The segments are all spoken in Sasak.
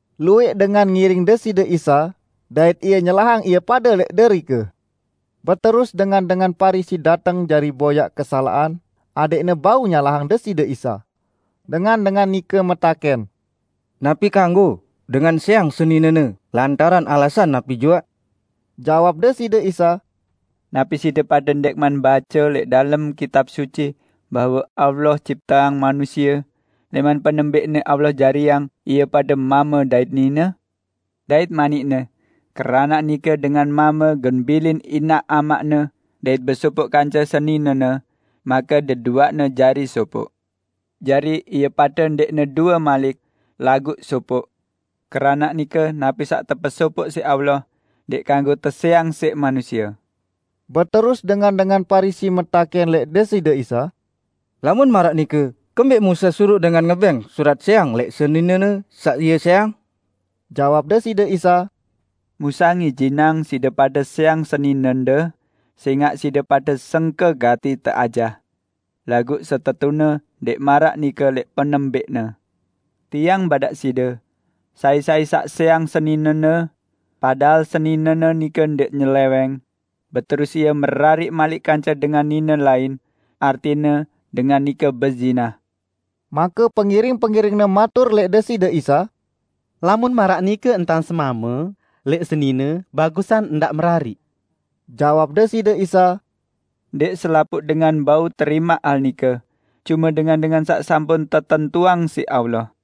Luwẽq dengan ngiring Deside Isa, dait Ie nyelahang ie pade lẽq derike. Beterus dengan-dengan Parisi dateng jari boyaq kesalaqan adẽqne bau nyalahang Deside Isa. Dengan-dengan nike metakẽn, "Napi kanggo dengan sẽang seninene lantaran alasan napi juaq?" Jawab Deside Isa, "Napi side pade ndẽqman bace lẽq dalem Kitab Suci bahwe Allah cipteang manusie, lẽman penembẽqne Allah jariang ie pade mame dait nine? Dait manik-Ne, 'Keranaq nike dengan mame gen bilin inaq amaqne dait besopoq kance seninene, make deduaqne jari sopoq.' Jari ie pade ndẽqne due malik, laguq sopoq. Keranaq nike napi saq tepesopoq siq Allah, ndẽq kanggo tesẽang siq manusie." Beterus dengan-dengan Parisi metakẽn lẽq Deside Isa, "Lamun maraq nike kembẽq Musa suruq dengan ngebẽng surat sẽang lẽq seninene saq ie sẽang?" Jawab Deside Isa, "Musa ngijinang side pade sẽang seninende sẽngaq side pade sengke gati teajah. Laguq setetune ndẽq maraq nike lẽq penembẽqne. Tiang badaq side: Sai-sai saq sẽang seninene -- padahal seninene nike ndẽq nyelẽwẽng -- beterus ie merariq malik kance dengan nine lain, artine dengan nike bezinah." Make pengiring-pengiring-Ne matur lẽq Deside Isa, "Lamun maraq nike entan semame lẽq senine, bagusan ndaq merariq." Jawab Deside Isa, "Ndẽq selapuq dengan bau terimaq hal nike, cume dengan-dengan saq sampun tetentuang siq Allah.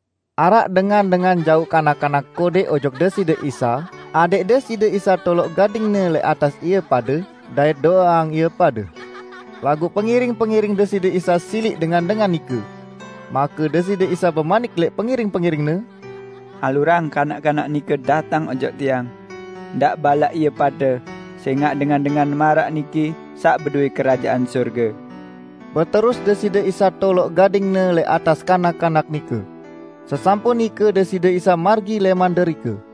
Araq dengan-dengan jauq kanak-kanak kodẽq ojok Deside Isa adẽq Deside Isa toloq gading-Ne lẽq atas ie pade dait do'eang ie pade. Laguq pengiring-pengiring Deside Isa siliq dengan-dengan nike. Make Deside Isa bemanik lẽq pengiring-pengiring-Ne, "Alurang kanak-kanak nike dateng ojok Tiang! Ndaq balaq ie pade sẽngaq dengan-dengan maraq niki saq bedowẽ Kerajaan Sorge." Beterus Deside Isa toloq gading-Ne lẽq atas kanak-kanak nike. Sesampun nike Deside Isa margi lẽman derike.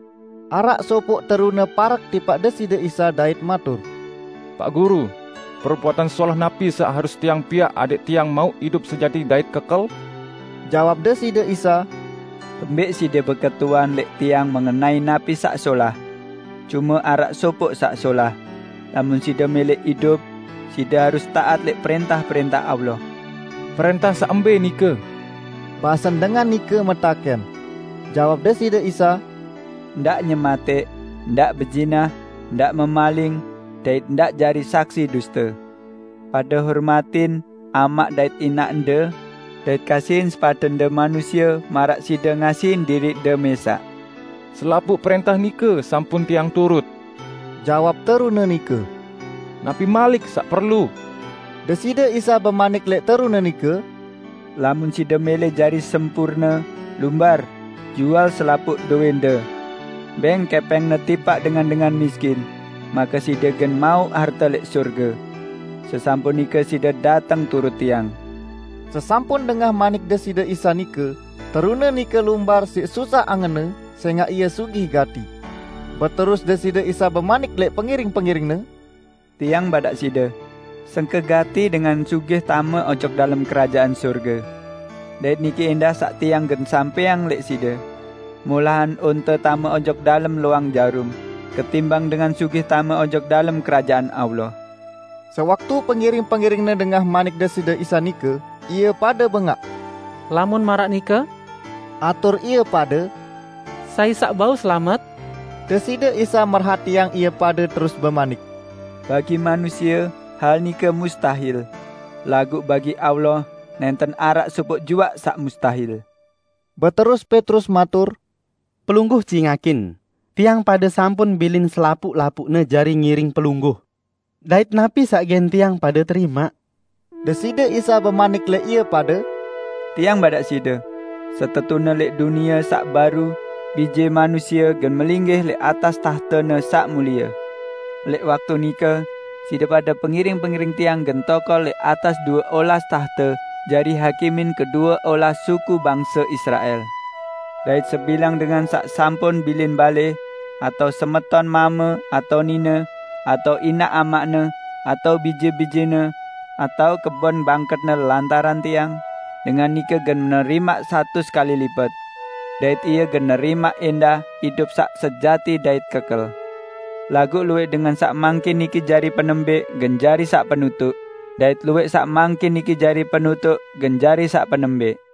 Araq sopoq terune parek tipaq Deside Isa dait matur, "Paq Guru, perbuatan solah napi saq harus tiang piaq adẽq tiang mauq idup sejati dait kekel?" Jawab Deside Isa, "Kembẽq side beketuan lẽq Tiang mengenai napi saq solah? Cume araq Sopoq saq solah. Lamun side mẽlẽ idup, side harus taat lẽq prẽntah-prẽntah Allah." "Prẽntah saq mbẽ nike?" basen dengan nike metakẽn. Jawab Deside Isa, "Ndaq nyematẽq, ndaq bezinah, ndaq memaling dait ndaq jari saksi duste, pade hormatin amaq dait inaqde; dait kasihin sepadende manusie maraq side ngasihin diriqde mẽsaq." "Selapuq prẽntah nike sampun tiang turut," jawab terune nike. "Napi malik saq perlu?" Deside Isa bemanik lẽq terune nike, "Lamun side mẽlẽ jari sempurne, lumbar, jual selapuq dowẽnde. Bẽng kẽpẽngne tipaq dengan-dengan miskin, make side gen mauq harte lẽq sorge. Sesampun nike side dateng turut Tiang!" Sesampun dengah manik Deside Isa nike, terune nike lumbar siq susah angenne sẽngaq ie sugih gati. Beterus Deside Isa bemanik lẽq pengiring-pengiring-Ne, "Tiang badaq side, sengke gati dengan sugih tame ojok dalem Kerajaan Sorge. Dait niki ẽndah saq Tiang gen sampẽang lẽq side: Molahan onte tame ojok dalem loang jarum, ketimbang dengan sugih tame ojok dalem Kerajaan Allah." Sewaktu pengiring-pengiring-Ne dengah manik Deside Isa nike, ie pade bengaq. "Lamun maraq nike," atur ie pade, "sai saq bau selamet?" Deside Isa merhatiang ie pade terus bemanik, "Bagi manusie hal nike mustahil! Laguq bagi Allah nẽnten araq sopoq juaq saq mustahil." Beterus Petrus matur, "Pelungguh cingakin, tiang pade sampun bilin selapuq-lapuqne jari ngiring Pelungguh. Dait napi saq gen tiang pade terimaq?" Deside Isa bemanik lẽq ie pade, "Tiang badaq side: Setetune lẽq Dunie saq Baru, Bije Manusie gen melinggih lẽq atas tahte-Ne saq mulie. Lẽq waktu nike side pade pengiring-pengiring Tiang gen tokol lẽq atas due olas tahte jari hakimin kedue olas suku bangse Israel! Dait sebilang dengan saq sampun bilin balẽ, atao semeton mame atao nine, atao inaq amaqne, atao bije-bijene, atao kebon bangketne lantaran Tiang, dengan nike gen nerimaq satus kali lipet. Dait ie gen nerimaq ẽndah idup saq sejati dait kekel. Laguq luwẽq dengan saq mangkin niki jari penembẽq, gen jari saq penutuq dait luwẽq saq mangkin niki jari penutuq gen jari saq penembẽq."